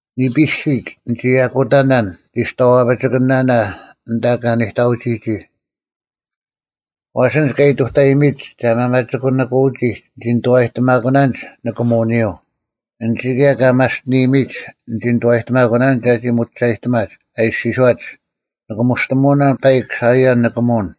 ᓂᐱᓯᒡ ᓂᒋ ᐊᑯᑕᓇᓐ ᓂᒋᔍᐛᐱᒋᑭᓂᒥᓇᓇ ᐊᓐᑕ ᑲ ᓂᑕᐅᒋᒋ᙮ ᐛᔅ ᐊᓐᒡ ᑲ ᐃᑐᑕᐃᔨᒥᒡ ᒐ ᒪᒪᒋᑯᓂᑯᐅᒋᒡ ᓂᒋ ᓂᑐᐛᔨᑎᒪᑯᓇᓐᒡ ᓂᑭᒧᐅᓂᔪᐤ; ᐊᓐᒡ ᑭᔭ ᑲ ᒪᔅᑎᓂᔨᒥᒡ ᓂᒋ ᓂᑐᐛᔨᒥᑯᓇᓐᒡ ᒐᒋ ᒧᒋᒐᔨᑎᒪᒡ, ᐊ ᐃᔅᒋᔄᒡ, “ᓂᑭᒧᔅᑎᒧᐅᓇᓐ ᐸᐃᒄ ᓴᐃᔭᓐ ᓂᑭᒧᐅᓐ!”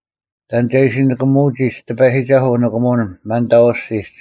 ᑕᓐ ᒐ ᐃᓯ ᓂᑭᒧᐅᒋᒡ ᑎᐸᔨᒋᒐᓱᐤ ᐅᓂᑭᒧᐅᓐ ᒪᓐᑕᐤ ᐊᔅᒋᒡ?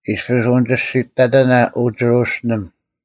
ᐃᔅᐱᔅ ᐅᓂᒋᔅᒋᑕᑕᓇ, ᐅ ᒋᕈᓯᓕᒻ,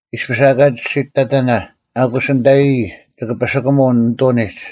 ᐃᔅᐱᔅ ᐊᑲ ᒋᔅᒋᑕᑕᓇ, ᐊᑯᔅ ᓂᑕᔨᔾ ᒋᑭ ᐸᓯᑯᒧ ᓂᑐᓂᒡ;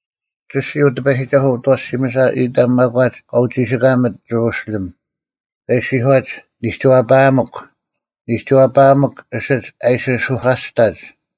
ᒋᔅᒋᓯ, ᐅ ᑎᐸᔨᒋᒐᓱᐤ, ᐅᑦ ᐊᐛᓯᒥᓴ ᐃᑕᒻ ᒪᒂᒡ ᑲ ᐅᒋᓯᑲᒥᑦ ᒋᕈᓯᓕᒻ; ᑲ ᐃᔅᒋᔄᒡ, “ᓂᒋᐛᐸᐊᒥᒄ, ᓂᒋᐛᐸᐊᒥᒄ, ᐊᓯᒡ ᐊ ᐃᓯ ᓱᐧᑲᔅᑕᒡ!”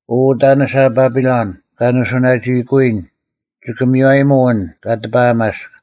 ᐅ ᐅᑕᓂᓴ ᐸᐱᓚᓐ, ᒐ ᓂᓱᐅᓇᒋᐃᑯᐅᔨᓐ; ᒋᑭ ᒥᔽᔨᒧᐤ ᐊᓐ ᑲ ᑎᐸᐊᒪᔅᒃ,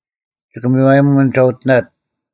ᒋᑭ ᒥᔽᔨᒧᐤ ᐊᓐ ᒐ ᐅᑎᓇᑦ